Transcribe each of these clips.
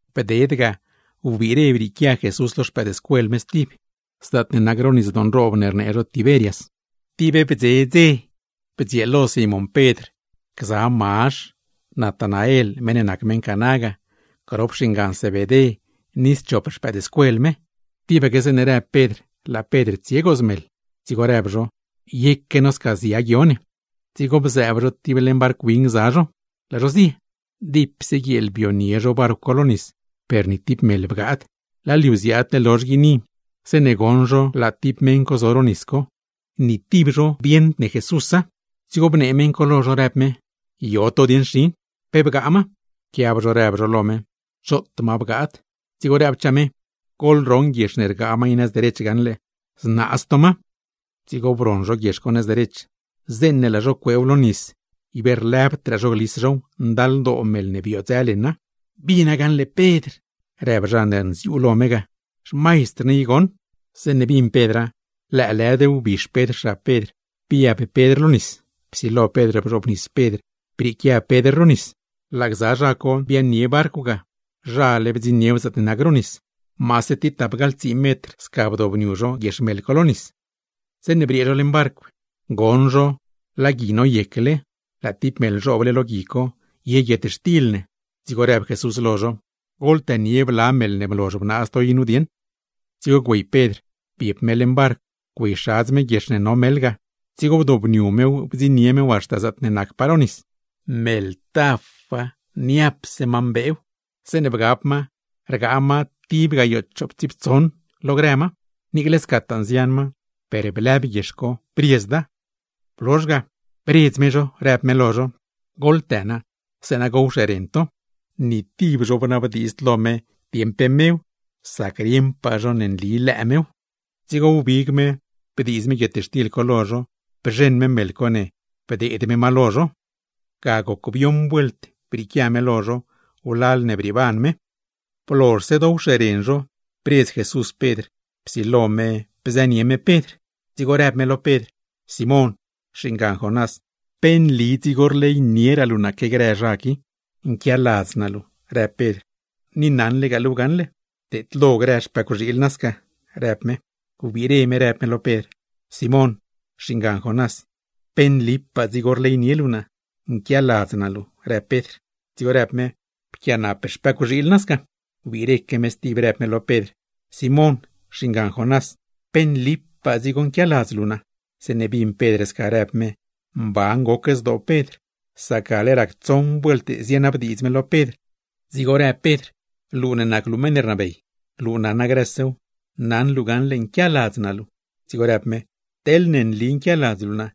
Bded ga, wbiire brieequia Jesús lo no stib, zaatne nac ro nisdoo nroob ne rnee zho Tiberias. Tib bdze dzew, tipse ndxie no gza no Simón Pedr, Mazh, Natanael (meṉ ne nac meṉ Caná ga), bets naa Jacob ni schop zha ne nacgza no. Tibaque zeeṉe në Pedr, laa Pedr tsie gooz meḻ. Dzigo rdzieets no: ―Yeque no sca zia guio ne. Dzigo bziaab no tib leṉ barcw win gza no, laa no zio. Dipse guieel bdzionie no barcw co lo nis, per ni tib meḻ bgaad. Laa liu ziaadle lozh guini, zeeṉe bdzioṉ no laa tib meṉ co zo ro nis, per ni tib no bdziuuṉbeyd me. Dzigo bnee meṉ co lo no, në me: ―Yo to dieṉ xin, ¿pe bgaa ma? Pquiab no rdzieets no lo me: ―Choot ma bgaad. Dzigo nëchaa me: ―Goḻroṉ guiex ne rgaa ma i nëz derech gaṉle, znaaz to ma. Dzigo broṉ no guiex co nëz derech. Zeeṉe laa no cueew lo nis, ib lëbd no glis now; ndaldoo meḻ ne biodzë leṉa. ―¡Pedr! ―rep naa―. ¡Bina gaṉle, xmaistr ne i goṉ! Zeeṉe bin Pedra, lëëlëd wbix Pedr xab Pedr, biab Pedr lo nis; psilo Pedr bzhoobnis Pedr brieequia Pedr ro nis. Laa no biaaṉ leṉ barcw ga; nole bdziṉniew zaatne nac ro nis. Maase tapgaḻtsii metr sca bdioobniu no guiex co lo nis. Zeeṉe briee no leṉ barcw, bdzioṉ no laa gui noyecle, laa tib meḻ zhooble lo gui co, ye guietxtil ne. Dzigo në Jesús lo no: ―Goḻtënie bla meḻ ne blozh bnaaz to i nu dieṉ. Dzigo güey Pedr biep me leṉ barcw, güeyxadz me guiex ne no meḻ ga; dzigo bdobniu mew bdziṉnie mew haxta zaatne nacpaa ro nis. Meḻ tafa, niapse ma mbeew, zeeṉe bgab ma rgaa ma tib gayoo chooptsiiptsoṉ lo grë ma; niicle scataa nzian ma, per blëb guiex co, briezda. Blozh ga, bredz me no, në me: ―¡Goḻtë na, zeeṉa gowxeren to! Ni tib no bnabdiidzd lo me dieṉ pe nli mew; sac, ¡rieṉpaa no ne nli mew! Dzigo wbig me bdiiz me guietxtil co lo no, bzheṉ me meḻ ne, bneedz me ma lo no. Ga bioṉ vuelt brieequia me lo no wlal ne brieeban me. Blozhse bdioowxeren no, bredz Jesús Pedr, psilo zho bzë zho grop zho; dzigo rëb me lo Pedr: ―Simón (xingan Jonás), ¿pe nli dzigo rleynieraa luu naa que grë zha qui? ―Nquialadz naa luu ―rëb Pedr―, ni naṉlegaa luuw gaṉle. ―Pteedlo grë xpëcwxiil win naa sca ―rëb me. Wbiire me, rëb me lo Pedr: ―Simón (xingan Jonás), ¿pe nlipaa dzigo rleynie luu naa? ―Nquialadz naa luu ―rëb Pedr. Dzigo rëb me: ―Pquianap xpëcwxiil naa sca. Wbiireque me stib rëb me lo Pedr: ―Simón (xingan Jonás), ¿pe nlipaa nquialadz luu naa? Zeeṉe bin Pedr sca rëb me, mban goc zdoo Pedr; sac gale rac tsoṉ vuelt zinabdiidz me lo Pedr, dzigo rëb Pedr: ―Luu nac meṉ ne rnabey, luu naṉa grësew, naṉ luu gaṉle nquialadz naa luu. Dzigo rëb me: ―Teḻne nli nquialadz luu naa,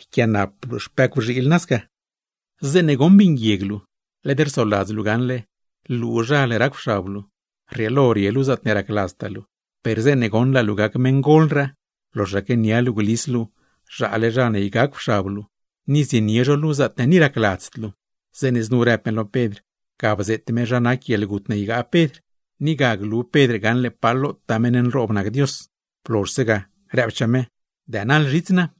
yquiaanap luu xpëcwxiil naa sca. ’Zeeṉe goṉ bii nguieg luu, led rsoladz luu gaṉle luuzhal racw xab luu, rrieelo rie luu zaatne racladztaa luu; per zeeṉe goṉ laa luu gac meṉgolraa, loxaque nia luu glis luu zhaale zha ne ygacwxab luu, ni zienie zho luu zaatne ni racladzd luu. Zeeṉe znu rëb me lo Pedr, ga bzeet me zha nac guieḻgut ne ygaa Pedr, ni ga glu Pedr gaṉle pa lotaa meṉ nroob nac Dios. Blozhse ga, rëbchaa me: ―¡Dënaḻ zhits naa!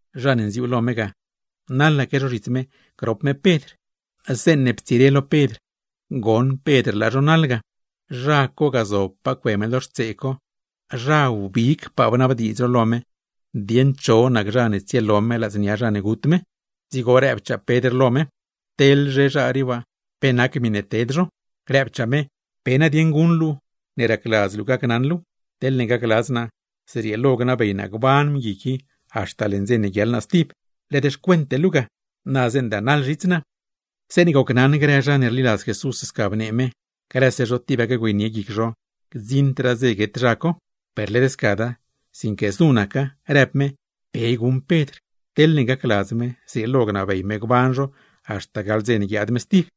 Dzigo naḻaque naa zhits me grop me Pedr. Zeeṉe ptsire lo Pedr, goṉ Pedr laa mëëdscuel ne scataa rleynie me ga, laa zho naḻ ga, zha ne zobpaa cue me ga lo xtsee co, zha ne wbigpaa bnabdiidz lo me dieṉ cho nac zha ne tsielo me ladznia zha ne gut me; dzigo rëbchaa Pedr lo me: ―Teḻzhe zha rii waa, ¿pe nac miṉe ted zho? Rëbchaa me: ―¿Pe nadieṉ guṉ luu ne racladz luu gacnaṉ luuw? Teḻne gacladz naa, zrieelo gnabey naa gban mgui haxta leṉ dze ne guiaḻ naa stib. Led xcuente luu ga. ¡Na zeeṉ dënaḻ zhits naa! Zeeṉe gocnaṉ grëraa zha ne rliladz Jesús sca bnee me, grëse zho tibaque güeynie guic zho gdziṉdraa dze guet naa. Per led scada, sinque znu naca, rëb me: ¡Pe guṉ Pedr! Teḻne gacladz me, zrieelo gnabey me gban naa haxta gaḻ dze ne guiaad me stib.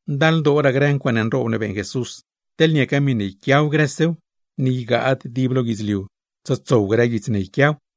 Ndaldooraa grë ncuaaṉe nroob ne beeṉ Jesús, teḻ niaca miṉe yquiaw grësew, ni ygaad dib lo guidzliu tsotsow grë guits ne yquiaw ga.